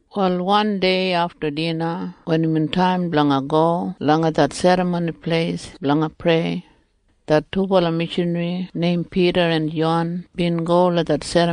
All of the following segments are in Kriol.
Wal wandei afta dina wen imbin taim blanga go langa det Serramoni Pleis blanga prei, det dubala mishanri neim Pida en Jon bin go du.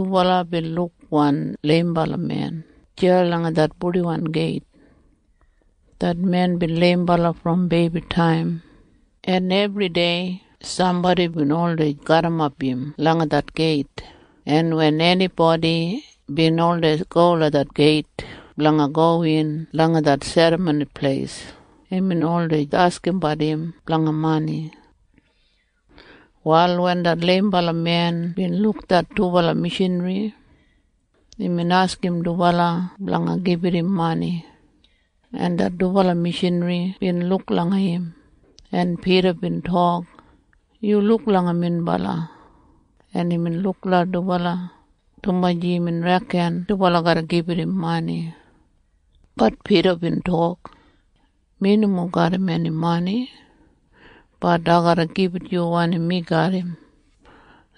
Wal wan leimbala men bin jidan deya langa det Purdiwan Geit. Det men bin leimbala brom beibitaim, en ebridei sambodi bin oldei garrimap im langa det geit, en wen enibodi bin oldei go langa det geit blanga gowin langa det Serramoni Pleis, imbin oldei askimbat olabat blanga mani. Wal wen det leimbala men bin luk det dubala mishanri, imbin askim dubala blanga gibit im mani, en det dubala mishanri bin luk langa im, en Pida bin tok, “Yu luk langa minbala.” En imbin luk langa dubala, dumaji imbin reken dubala garra gibit im mani. Bat Pida bin tok, “Mi nomo garram eni mani. Bat ai garra gibit yu wanim mi garram.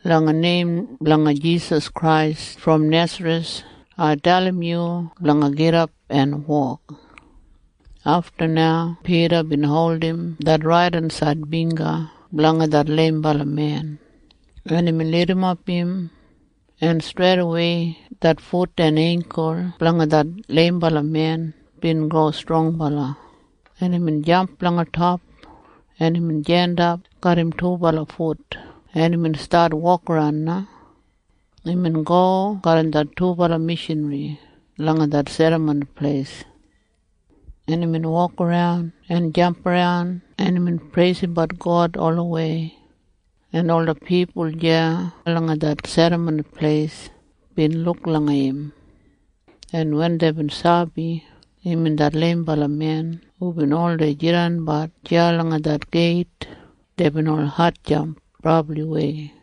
Langa neim blanga Jisas Krais brom Nesareth, ai dalim yu blanga gidap en wok!” Afta na Pida bin holdim det raidensaid bingga blanga det leimbala men, en imbin lidimap im, en streidawei det fut en eingkul blanga det leimbala men bin go strongbala, en imbin gidap en jandap garram im dubala fut en imbin stat wokaran na. Imbin go garram det dubala mishanri langa det Serramoni Pleis, en imbin wokaran en jamparan, en imbin preisimbat God olawei, en ola pipul deya langa det Serramoni Pleis bin luk langa im, en wen deibin sabi imbin det leimbala men hubin oldei jidanbat deya langa det geit, deibin ol hatjamp brabliwei.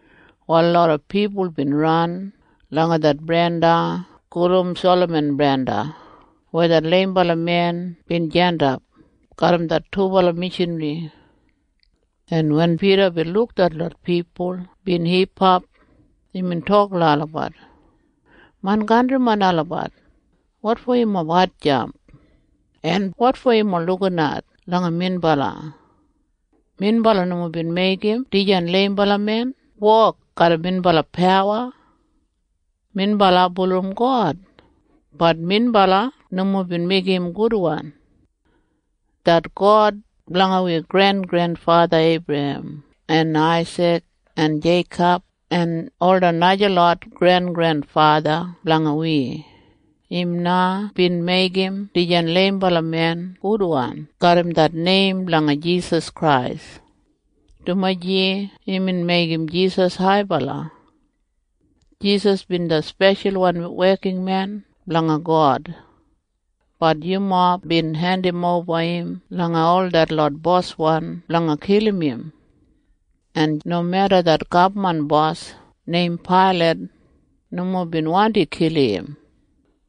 Wal loda pipul bin ran langa det brenda gulum Salaman Brenda weya det leimbala men bin jandap garram det dubala mishanri, en wen Pida bin luk detlot pipul bin hipap, imbin tok langa olabat, “Main kantrimen olabat, wotfo yumob hatjamp? En wotfo yumob lukinat langa minbala? Minbala nomo bin meigim dijan leimbala men wok garram minbala pawa. Minbala bulurrum God. Bat minbala nomo bin meigim im gudwan. Det God blanga wi grengrenfatha Eibrahem en Aisik en Jeikob en ola najalot grengrenfatha blanga wi, im na bin meigim dijan leimbala men gudwan garram det neim blanga Jisas Krais, dumaji imbin meigim Jisas haibala. Jisas bin det speshalwan wekinmen blanga God. Bat yumob bin hendimoba im langa ol detlot boswan blanga kilim im, en nomeda det gabman bos neim Pailat nomo bin wandi kilim im,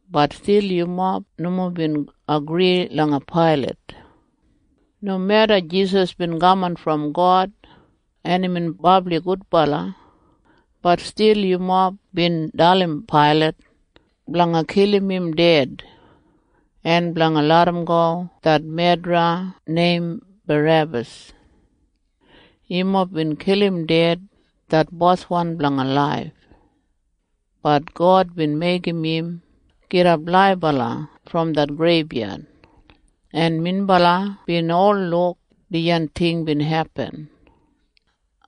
bat stil yumob nomo bin agri langa Pailat. Nomeda Jisas bin kaman brom God en imbin brabli gudbala, bat stil yumob bin dalim Pailat blanga kilim im ded en blanga larramgo det medra neim Barebas. Yumob bin kilim ded det Boswan blanga laif. Bat God bin meigim im gidap laibala brom det greibyad, en minbala bin ol luk dijan ting bin hepin.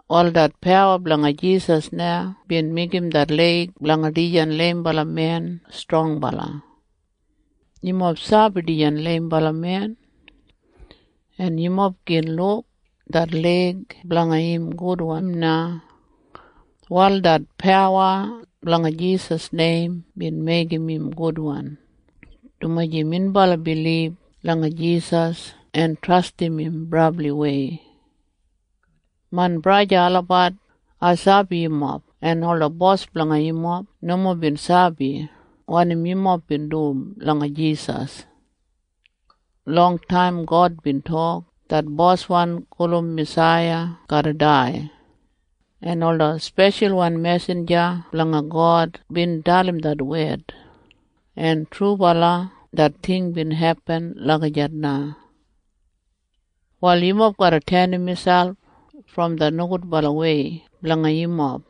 Wal det pawa blanga Jisas na bin meigim det leig blanga dijan leimbala men strongbala. Yumob sabi dijan leimbala men, en yumob gin luk det leig blanga im gudwan na. Wal det pawa blanga Jisas neim bin meigim im gudwan, dumaji minbala bilib langa Jisas en trastim im brabliwei. “Main braja olabat, ai sabi yumob en ola bos blanga yumob nomo bin sabi wanim yumob bin dum langa Jisas. Longtaim God bin tok det Boswan gulum Masaiya garra dai, en ola speshalwan mesinja blanga God bin dalim det wed, en trubala det ting bin hepin lagijat na. “Wal yumob garra tenim miselp brom det nogudbalawei blanga yumob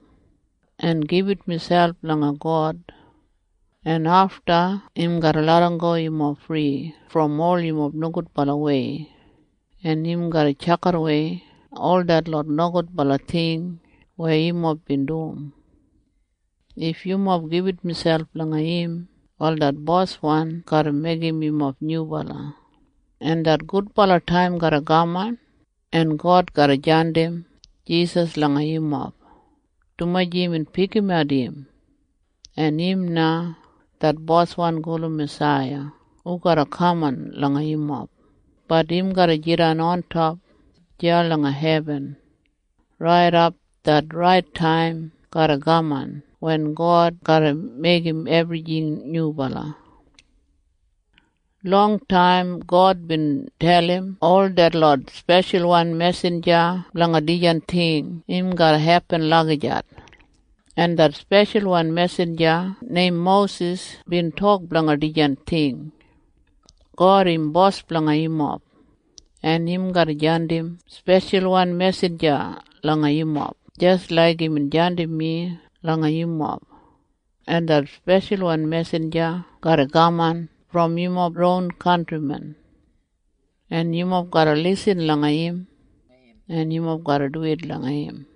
en gibit miselp langa God, en afta im garra larramgo yumob fri brom ol yumob nogudbalawei, en im garra tjakidawei ol detlot nogudbala ting weya yumob bin dum. If yumob gibit miselp langa im, wal det Boswan garra meigim yumob nyubala, en det gudbala taim garra kaman, en God garra jandim Jisas langa yumob, dumaji imbin pikimat im, en im na det Boswan gulum Masaiya hu garra kaman langa yumob. Bat im garra jidan ontop deya langa hebin raidap det rait taim garra kaman wen God garra meigim ebrijing nyubala. “Longtaim God bin dalim ol detlot speshalwan mesinja blanga dijan ting im garra hepin lagijat, en det speshalwan mesinja neim Mosis bin tok blanga dijan ting. ‘God im Bos blanga yumob, en im garra jandim speshalwan mesinja langa yumob jis laik imbin jandim mi langa yumob, en det speshalwan mesinja garra kaman brom yumob ron kantrimen, en yumob garra lisin langa im, en yumob garra duwit langa im.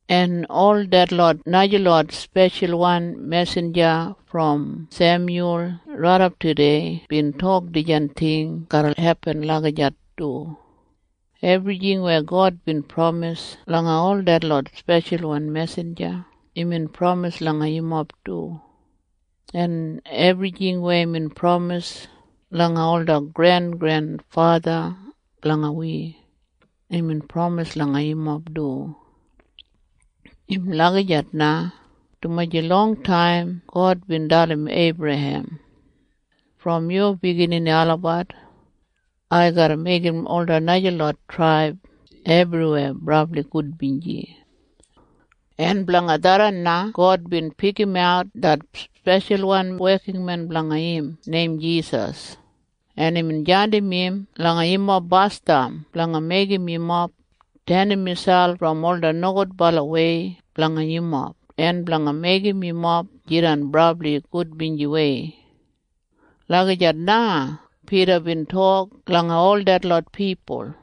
“En ol detlot najalot speshalwan mesinja brom Semyul raidap tudei bin tok dijan ting garra hepin lagijat du. Ebrijing weya God bin pramis langa ol detlot speshalwan mesinja, imbin pramis langa yumob du. En ebrijing weya imbin pramis langa ola grengrenfatha blanga wi, imbin pramis langa yumob du. Im lagijat na, dumaji longtaim God bin dalim Eibrahem. ‘Brom yu biginini olabat, ai garra meigim ola najalot traib ebriweya brabli gudbinji.’ En blanga tharran na God bin pikimat det speshalwan wekinmen blanga im neim Jisas, en imbin jandim im langa yumob basdam blanga meigim yumob tenim miselp brom ola nogudbalawei blanga yumob en blanga meigim yumob jidan brabli gudbinjiwei.” Lagijat na Pida bin tok langa ol detlot pipul.